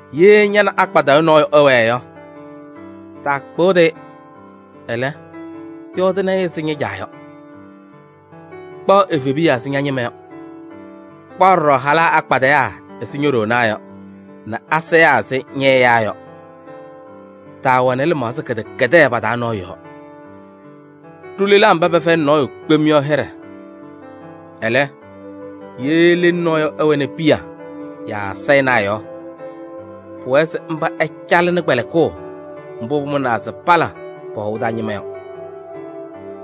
Ye ña nɛ akpadɩyʋ nɔɔyʋ ɩwɛɛ yɔ, taakpɩɣdɩ-ɩ, ɛlɛ, yɔɔdɩnɩ-ɩ ɛzɩ ña-caa yɔ. Kpaɣ evebiya ɛzɩ ña-ñɩma yɔ. Kpaɣ ɖɔɖɔ halaa akpadɩyaa ɛzɩ ño-ɖoonaa yɔ nɛ asayaa ɛzɩ ñɛ-ɛyaa yɔ. Taawɛnɩ lɩmaɣza kɩdɛkɛdɛɛ pa-taa nɔɔyʋ yɔɔ. Ɖʋ lelaa mba pɛfɛyɩnɩ nɔɔyʋ kpem yɔ hɩɖɛ. Ɛlɛ, ye lelu nɔɔyʋ ɛwɛnɩ piya yaa sayɩnaa yɔ, pʋwɛɛ se mba ɛcalɩnɩ kpɛlɩkʋʋ mbʋ pʋmʋnaa se pala pɔ-hɔʋ taa ñɩma yɔ.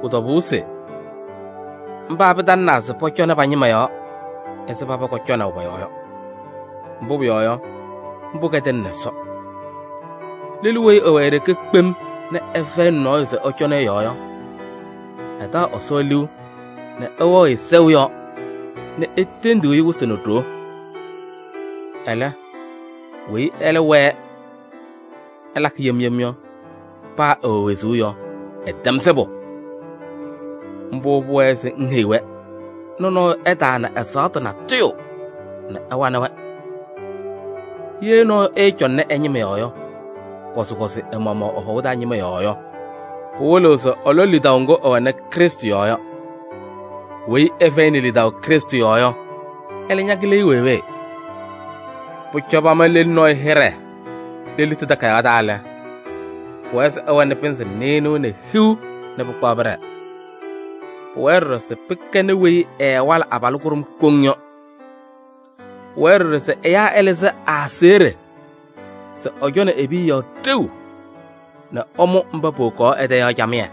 Pʋ-tɔbʋʋ se mba pɩtalɩnaa se pɔcɔnɩ pa-ñɩma yɔɔ ɛzɩ paba kɔcɔnaʋ pɔ-yɔɔ yɔ. Mbʋ pʋyɔɔ yɔ, mbʋ kɛdɩnɩnɩ Ɛsɔ. Lelu weyi ɛwɛ e-ɖeke kpem nɛ ɛfɛyɩnɩ nɔɔyʋ se ɛcɔnɩ ɛ-yɔɔ yɔ, ɛtaɣ Ɛsɔ liu nɛ ɛwɛɣ-ɩ sɛʋ yɔɔ nɛ etendiɣ-i wɩsɩ nɛ ɖoo. Ɛlɛ, weyi ɛlɛ wɛɛ ɛlakɩ yem yem yɔ, paa ɛwɛ wezuu yɔ, ɛtɛm sɩbʋ. Mbʋ pʋwɛɛ se ŋheyi-wɛ nɛ nɔɔyʋ ɛtaana ɛzaɣtʋ natʋyʋ nɛ ɛwanɩ-wɛ. Ye nɔɔyʋ ɛɛcɔŋnɩ ɛ-ñɩma yɔɔ, kɔzɩkɔzɩ ɛ-maɣmaɣ ɛ-hɔʋ taa ñɩma yɔɔ yɔ, pɩwɩlɩɣ se ɛlɔ lidaʋ ŋgʋ ɛwɛnɩ Krɩstʋ yɔɔ yɔ. Weyi ɛfɛyɩnɩ lidaʋ Krɩstʋ yɔɔ yɔ, ɛlɛ ñakɩlɩ-ɩ wee wee. Pʋcɔ pama lelu nɔɔyʋ hɩɖɛ lelitu takayaɣ taa lɛ, pʋwɛɛ se ɛwɛnɩ pɩnzɩ nɩɩnʋwa nɛ hiu nɛ pɩkpaɣ pɩɖɛɛ. Pʋwɛɛ ɖɔɖɔ se pɩkɛnɩ weyi ɛɛwalɩ abalʋ kʋɖʋm koŋ yɔ. Pʋwɛɛ ɖɔɖɔ se ɛyaa ɛlɩzɩ ɛ-aseɣɖe se ɛcɔnɩ e-piya yɔɔ ɖeu nɛ ɛmʋ mba powokaɣ ɛ-tɛ yɔ camɩyɛ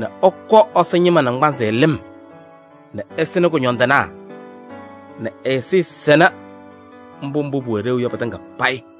nɛ ɛkɔ Ɛsɔ ñɩma naŋgbanzɩ lɩm nɛ ɛsɩnɩ kʋñɔndɩnaa nɛ ñɛ-ɛzɩyɛ sɛnɩ mbʋ mbʋ pʋwɛ ɖeu yɔ pɩtɩŋa payɩ.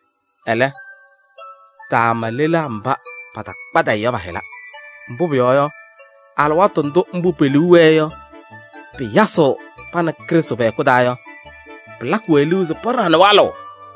Ɛlɛ, taama lelaa mba patakpadɩyɩ yɔ pa-hɩla. Mbʋ pʋyɔɔ yɔ, alɩwaatʋ ndʋ mbʋ pe-liu wɛɛ yɔ pɩyasɩɣ pa nɛ Krɩstʋ pɛ-hɛkʋ taa yɔ, pɩlakɩ-wɛ liu se paɖaɣnɩ walʋʋ.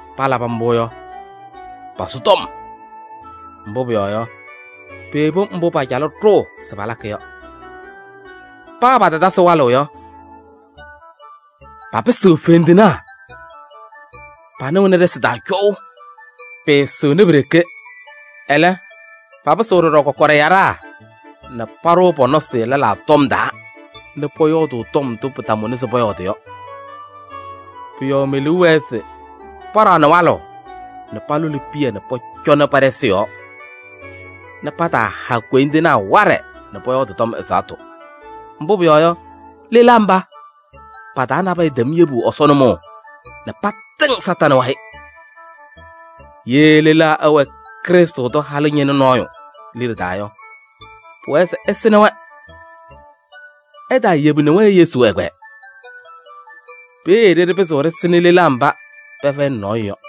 Palabɩ mbʋ yɔ, pasʋʋ tɔm. Mbʋ pʋyɔɔ yɔ, peyebi mbʋ pacalɩ ɖʋʋ se palakɩ yɔ. Paa patatasɩ walʋʋ yɔ, papɩsɩɣ fendinaa, panɩɣnɩ ɖɩsɩ taa cɔʋ. Pɩɩsɩɣnɩ pi-ɖeke. Ɛlɛ, papɩsɩɣ ɖɔɖɔ kɔkɔɖɛ yaɖaa nɛ paɖʋʋ pɔ-nɔsɩ lɛlaa tɔm taa nɛ pɔyɔɔdʋʋ tɔm ndʋ pɩtamʋnɩ se pɔyɔɔdɩ yɔ. Pʋ-yɔɔ me-liu wɛɛ se paɖaɣnɩ walʋʋ nɛ palʋlɩ piya nɛ pɔcɔnɩ pa-ɖɩsɩ yɔɔ nɛ pataaha koyindinaa waɖɛ nɛ pɔyɔɔdɩ tɔm ɛzaɣtʋ. Mbʋ pʋyɔɔ yɔ, lelaa mba, pa-taa nabɛyɛ tɛm yebu Ɛsɔ nʋmɔʋ nɛ patɩŋ Satanɩ wayɩ. Ye lelaa ɛwɛ Krɩstʋ tʋ halʋ ñɩnʋ nɔɔyʋ liɖe taa yɔ, pʋwɛɛ se ɛsɩnɩ-wɛ. Ɛtaayebini-wɛ Yesu ɛgbɛyɛ. Peeye ɖɩɖɩ pɩzɩɣ ɖɩsɩnɩ lelaa mba pɛfɛyɩnɩ nɔɔyʋ yɔ.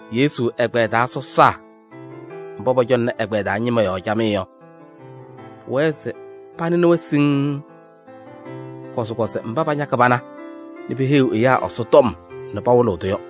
Yesu ɛgbɛyɛ taa sɔsaa mba pɔcɔŋnɩ ɛ-ɛgbɛyɛ taa ñɩma yɔɔ camɩyɛ yɔ, pʋwɛɛ se panɩnɩ-wɛ siŋŋ. Kɔzɩkɔzɩ mba pañakɩ pana nɛ peheyiɣ ɛyaa Ɛsɔtɔm nɛ pawɩlɩɣ-tʋ yɔ.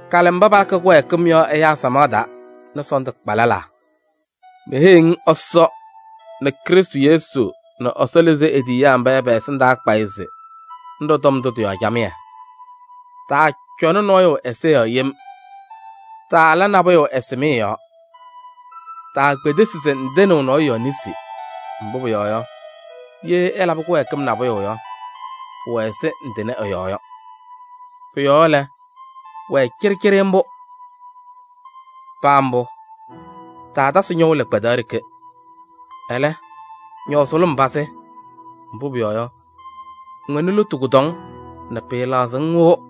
Kalɩ mba palakɩ kɩwɛɛkɩm yɔ ɛyaa samaɣ taa nɛ sɔɔndʋ kpa lɛlaa. Meheyiɣ-ŋ Ɛsɔ nɛ Krɩstʋ Yesu nɛ Ɛsɔ lɩzɩ e-tiyiyaa mba yɔ pɛ-ɛsɩndaa kpayɩ se ŋɖɔ tɔm ndʋ tɩ-yɔɔ camɩyɛ. Taacɔnɩ nɔɔyʋ ɛza yɔɔ yem, taala nabʋyʋ ɛsɩmɩyɛ yɔɔ. Taakpedesi se ŋtɩnɩɣ nɔɔyʋ yɔɔ nesi. Mbʋ pʋyɔɔ yɔ, ye ɛlabɩ kɩwɛɛkɩm nabʋyʋ yɔ, pʋwɛ ɛzɩ ŋtɩnɩ ɛ-yɔɔ yɔ. Pʋ-yɔɔ lɛ, wɛɛ cɩɖɩcɩɖɩ mbʋ. Paa mbʋ, taatasɩ ñɔʋ lɩkpadaɣ ɖeke, ɛlɛ, ñɔɔ sʋlʋm pazɩ. Mbʋ pʋyɔɔ yɔ, ŋwɛnɩ lotu kʋdɔŋ nɛ pɩɩlaɣzɩɣ-ŋ wɩʋ.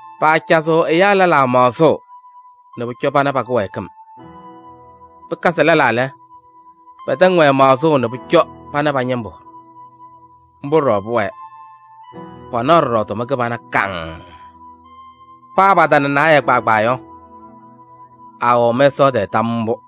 Paacazɩɣ ɛyaa lɛlaa maɣzʋʋ nɛ pʋcɔ pana pa-kɩwɛɛkɩm. Pɩkazɩ lɛlaa lɛ, pɛtɛŋ-wɛ maɣzʋʋ nɛ pʋcɔ pana pa-ñɩmbʋ. Mbʋ ɖɔɖɔ pʋwɛɛ, panaɣ ɖɔɖɔ tʋma kɩbana kaŋŋ. Paa patana naayɛ kpaagbaa yɔ, aawɛɣ mɛsaɣ tɛɛ tam mbʋ.